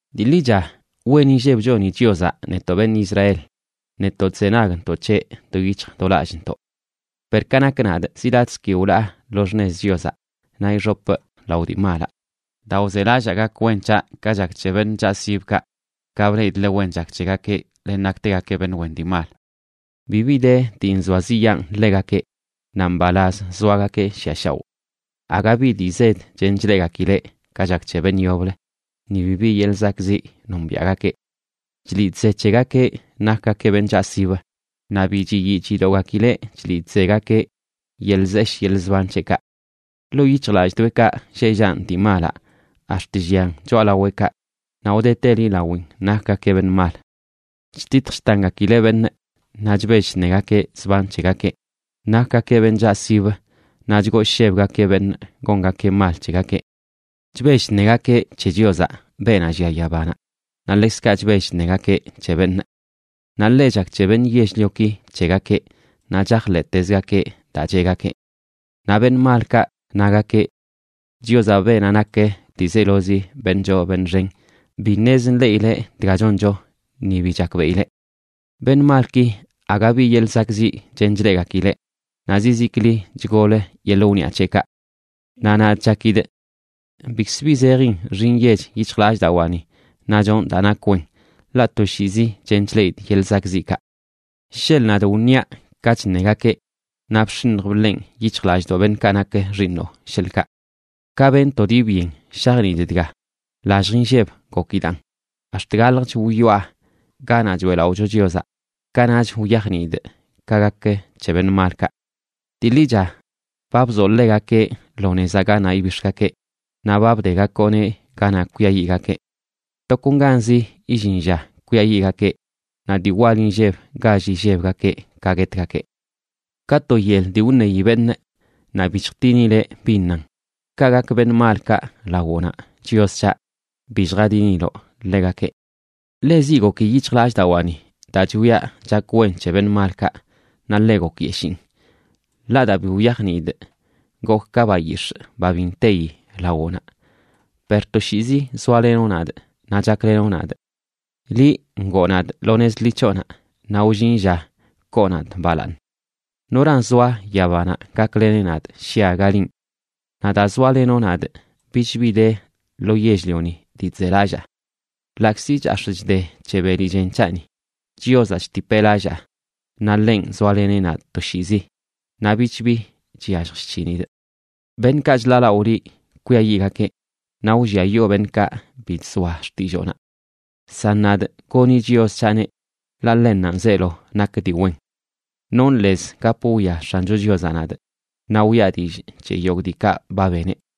Dii ḻicha, wen inlleb choni Chiozaꞌ netoꞌ beṉꞌ Israel, netoꞌ chzenagntoꞌ c̱heꞌ do yic̱hj do lallꞌntoꞌ. Per ka nak nadꞌ, zi latꞌzə ki wlaa lo xṉez Chiozaꞌ, naꞌ ixopꞌ lao dii malaꞌ, daa wzelallaa gak wen c̱haꞌ ka chak c̱he beṉꞌ chaꞌsibkaꞌ, ka bleꞌidꞌ ḻe wen chak c̱hegakeꞌ, len naktegakeꞌ beṉꞌ wen dii mal. Bibi de dii nzoaziꞌyaan ḻegakeꞌ; naꞌ mbalaz zoagakeꞌ shiꞌa shaoꞌ. Aga bi dii zed chen chleꞌgakileꞌ ka chak c̱he beṉꞌ yoblə, ni bibi yeḻꞌ zakꞌziꞌ nombiaꞌgakeꞌ. Chliꞌ chze c̱hegakeꞌ nakgakeꞌ beṉꞌ chaꞌsib, naꞌ bi chiyii chidogakileꞌ chliꞌ chzegakeꞌ yeḻꞌ zeshꞌ yeḻꞌ zban c̱heꞌkaꞌ. Ḻoo yic̱hjlalldoeꞌkaꞌ lleꞌ llanꞌ dii malaꞌ ax̱t llian choꞌalaweꞌkaꞌ, naꞌ wdeteli lawin nakgakeꞌ beṉꞌ mal. Chtitj chtangakileꞌ beṉꞌ, naꞌ chbell chṉegakeꞌ zban c̱hegakeꞌ; nakgakeꞌ beṉꞌ chaꞌsib naꞌ chgooshebgakeꞌ beṉꞌ gongakeꞌ mal c̱hegakeꞌ. Chbell chṉegakeꞌ c̱he Chiozaꞌ, beenaꞌ llia yabanaꞌ, naꞌ ḻekzkaꞌ chbell chṉegakeꞌ c̱he beṉꞌ. Naꞌ ḻe chak c̱he beṉꞌ yell-lioki c̱hegakeꞌ naꞌ chajḻeꞌtezgakeꞌ daa cheꞌgakeꞌ. Naꞌ beṉꞌ malkaꞌ nagakeꞌ: Chiozaꞌ, beenaꞌ nak ḻiizelozi beṉꞌ choo beṉꞌ xen, bi ṉez nḻeꞌileꞌ dga choncho ni bi chakbeꞌileꞌ. Beṉꞌ malki, aga bi yeḻꞌ zakꞌziꞌ chen chleꞌgakileꞌ, naꞌ zizikli chgol yeḻꞌ wniꞌa c̱heꞌkaꞌ. Naꞌ nadꞌ chakidꞌ bikz bi zejin nxi nyech yic̱hjlallꞌdawaani, naꞌ chonꞌ daa nak wen. Ḻaꞌ toshiizi chen chleꞌidꞌ yeḻꞌ zakꞌziꞌkaꞌ. Sheḻꞌ nadꞌ wṉiaꞌ ka chṉegakeꞌ, naꞌ bx̱iṉj bḻenꞌ yic̱hjlallꞌdoꞌ beṉꞌkaꞌ nak xiiṉoꞌ, sheḻꞌkaꞌ. Ka benꞌ to dii byen shajniidꞌ dga, lallj inlleb gokidaan, ax̱t galjch wyoꞌa ganaꞌ choeꞌlaꞌocho Chiozaꞌ, kanaꞌch wyajniidꞌ ka gak c̱he beṉꞌ malkaꞌ. Dii ḻicha ba bzoꞌ ḻegakeꞌ lo nezaꞌ ganaꞌ ibix̱gakeꞌ, naꞌ ba bdegakoꞌneꞌ ganaꞌ kwiayiꞌgakeꞌ. Tokonganzi illin lla kwiayiꞌgakeꞌ, naꞌ dii wal inlleb gall illebgakeꞌ ka guetgakeꞌ. Ka to yel dii wṉeyi beṉꞌ naꞌ bi chjtinileꞌ bin nan, kaꞌ gak beṉꞌ malkaꞌ lawoꞌnaꞌ, Chios c̱haꞌ, bi lljadiniloꞌ ḻegakeꞌ. Ḻe ziꞌ goki yic̱hjlallꞌdawaani daa chwiaꞌ chak wen c̱he beṉꞌ malkaꞌ, naꞌ ḻe gokyeshiin. Ḻaꞌ daa bi wyajniidꞌ gokꞌ ka bayix̱ꞌ, ba bi nteyi lawoꞌnaꞌ. Per toshiizi zoalenoꞌ nadꞌ naꞌ chaklenoꞌ nadꞌ. Liꞌ ngoo nadꞌ lo nez ḻi c̱hoꞌnaꞌ, naꞌ wllin lla koo nadꞌ balaaṉ. ¿Noran zoa yabanaꞌ gakleneꞌ nadꞌ shi aga linꞌ? Naꞌ daa zoalenoꞌ nadꞌ bichbi de lo yell-lioni dii chzelallaa. Ḻaꞌkzi chax̱ꞌ chde c̱he beli chen c̱haꞌni, Chiozaꞌ chtipeꞌ lallaa, naꞌ ḻenꞌ zoaleneꞌ nadꞌ toshiizi, naꞌ bich bi chyallj chc̱hinidꞌ. Beṉꞌkaꞌ chḻaalaꞌo liꞌ kwiayiꞌgakeꞌ, naꞌ wlliayoo beṉꞌkaꞌ bi chzoa xtilloonaꞌ. San nadꞌ, goni Chios c̱haꞌneꞌ, ḻaꞌ ḻennanꞌ zeelo nak dii wen. Nonꞌ lez gap wwia X̱ancho Chiozaꞌ nadꞌ, naꞌ wiꞌa dillꞌ c̱he yogꞌ diikaꞌ ba beneꞌ.